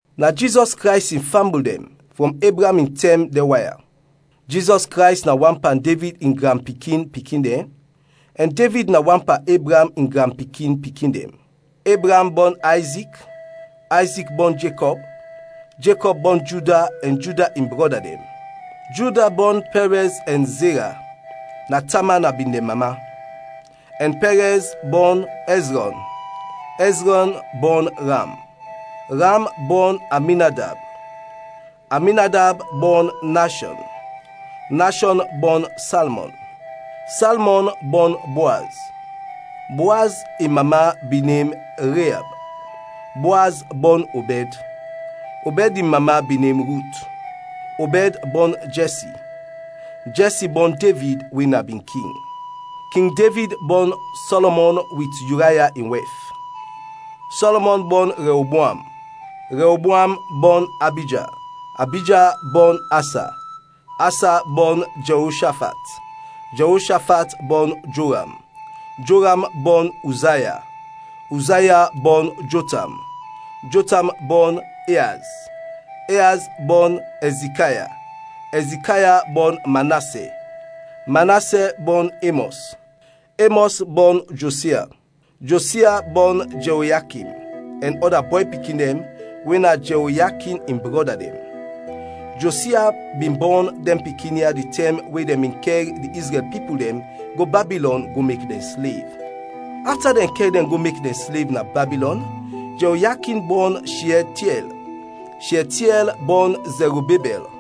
Na Jizɔs Krays in fambul dɛn, frɔm Ebraam in tɛm dɛn wan ya: Jizɔs Krays na wan pan Devid in granpikin-pikin dɛn, ɛn Devid na wan pan Ebraam in granpikin-pikin dɛn. Ebraam bɔn Ayzik, Ayzik bɔn Jekɔb, Jekɔb bɔn Juda ɛn Juda in brɔda dɛn, Juda bɔn Pɛrɛz ɛn Zera (na Tama na bin dɛn mama), ɛn Pɛrɛz bɔn Ɛzrɔn, Ɛzrɔn bɔn Ram. Ram bɔn Aminadab, Aminadab bɔn Nashɔn, Nashɔn bɔn Salmɔn, Salmɔn bɔn Boaz (Boaz in mama bin nem Reab), Boaz bɔn Obɛd (Obɛd in mama bin nem Rut), Obɛd bɔn Jɛsi, Jɛsi bɔn Devid we na bin king. King Devid bɔn Sɔlɔmɔn wit Yuraya in wɛf, Sɔlɔmɔn bɔn Rɛoboam, Rɛoboam bɔn Abija, Abija bɔn Asa, Asa bɔn Jɛoshafat, Jɛoshafat bɔn Joram, Joram bɔn Uzaya, Uzaya bɔn Jotam, Jotam bɔn Eaz, Eaz bɔn Ɛzikaya, Ɛzikaya bɔn Manasɛ, Manasɛ bɔn Emɔs, Emɔs bɔn Josia, Josia bɔn Jɛoyakin ɛn ɔda bɔy pikin dɛn we na Jɛoyakin in brɔda dɛn. Josia bin bɔn dɛn pikin ya di tɛm we dɛn bin kɛr di Izrɛl pipul dɛn go Babilɔn go mek dɛn slev. Afta dɛn kɛr dɛn go mek dɛn slev na Babilɔn, Jɛoyakin bɔn Shiɛltiɛl, Shiɛltiɛl bɔn Zɛrubabɛl,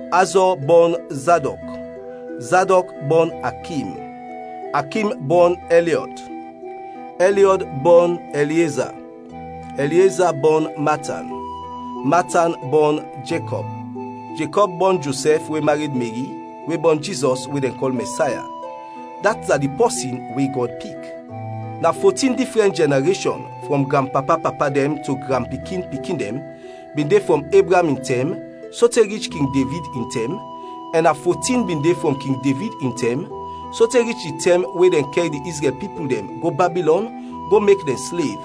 Azɔ bɔn Zadɔk, Zadɔk bɔn Akim, Akim bɔn Ɛliɔd, Ɛliɔd bɔn Ɛlieza, Ɛlieza bɔn Matan, Matan bɔn Jekɔb, Jekɔb bɔn Josɛf we mared Meri we bɔn Jizɔs, we dɛn kɔl Mɛsaya, dat na di pɔsin we Gɔd pik. Na fotin difrɛn jɛnareshɔn (frɔm granpapa-papa dɛn to granpikin-pikin dɛn) bin de frɔm Ebraam in tɛm sote rich King Devid in tɛm, ɛn na fotin bin de frɔm King Devid in tɛm sote rich di tɛm we dɛn kɛr di Izrɛl pipul dɛn go Babilɔn go mek dɛn slev,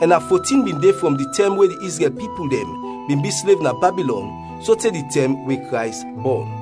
ɛn na fotin bin de frɔm di tɛm we di Izrɛl pipul dɛn bin bi slev na Babilɔn sote di tɛm we Krays bɔn.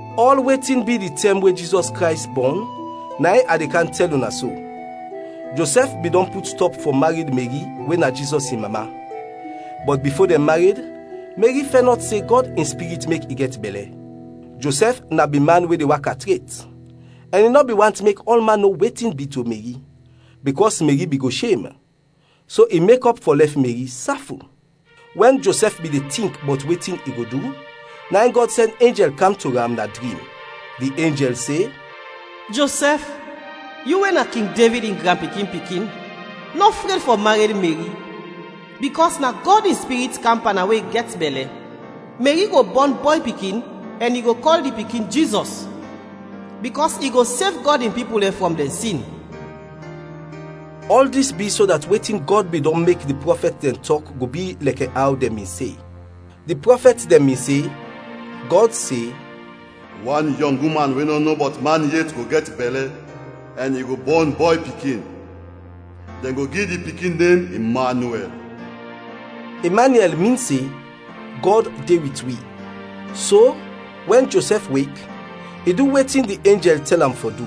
Ɔl wetin bi di tɛm we Jizɔs Krays bɔn na in a de kam tɛl una so: Josɛf bin dɔn put stɔp fɔ mared Meri we na Jizɔs in mama, bɔt bifo dɛn mared, Meri fɛnɔt se Gɔd in Spirit mek i gɛt bɛlɛ. Josɛf na bin man we de waka tret, ɛn i nɔ bin want mek ɔlman no wetin bi to Meri, bikɔs Meri bin go shem. So i mekɔp fɔ lɛf Meri, saful. Wɛn Josɛf bin de tink bɔt wetin i go du, na in Gɔd sɛn enjɛl kam to am na drim. Di enjɛl se, “Josɛf, yu we na King Devid in granpikin-pikin nɔ fred fɔ mared Meri, bikɔs na Gɔd in Spirit kam pan am we i gɛt bɛlɛ. Meri go bɔn bɔy pikin ɛn yu go kɔl di pikin Jizɔs; bikɔs i go sev Gɔd in pipul dɛn frɔm dɛn sin.” Ɔl dis bi so dat wetin Gɔd bin dɔn mek di prɔfɛt dɛn tɔk go bi lɛkɛ aw dɛn bin se. Di prɔfɛt dɛn bin se, Gɔd se, “Wan yɔng uman we nɔ no bɔt man yet go gɛt bɛlɛ ɛn i go bɔn bɔy pikin, dɛn go gi di pikin nem Imanyuɛl” (Imanyuɛl min se, Gɔd de wit wi). So wɛn Josɛf wek, i du wetin di enjɛl tɛl am fɔ du;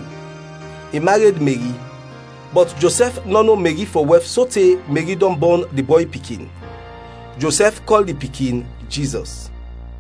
i mared Meri. Bɔt Josɛf nɔ no Meri fɔ wɛf sote Meri dɔn bɔn di bɔy pikin. Josɛf kɔl di pikin, Jizɔs.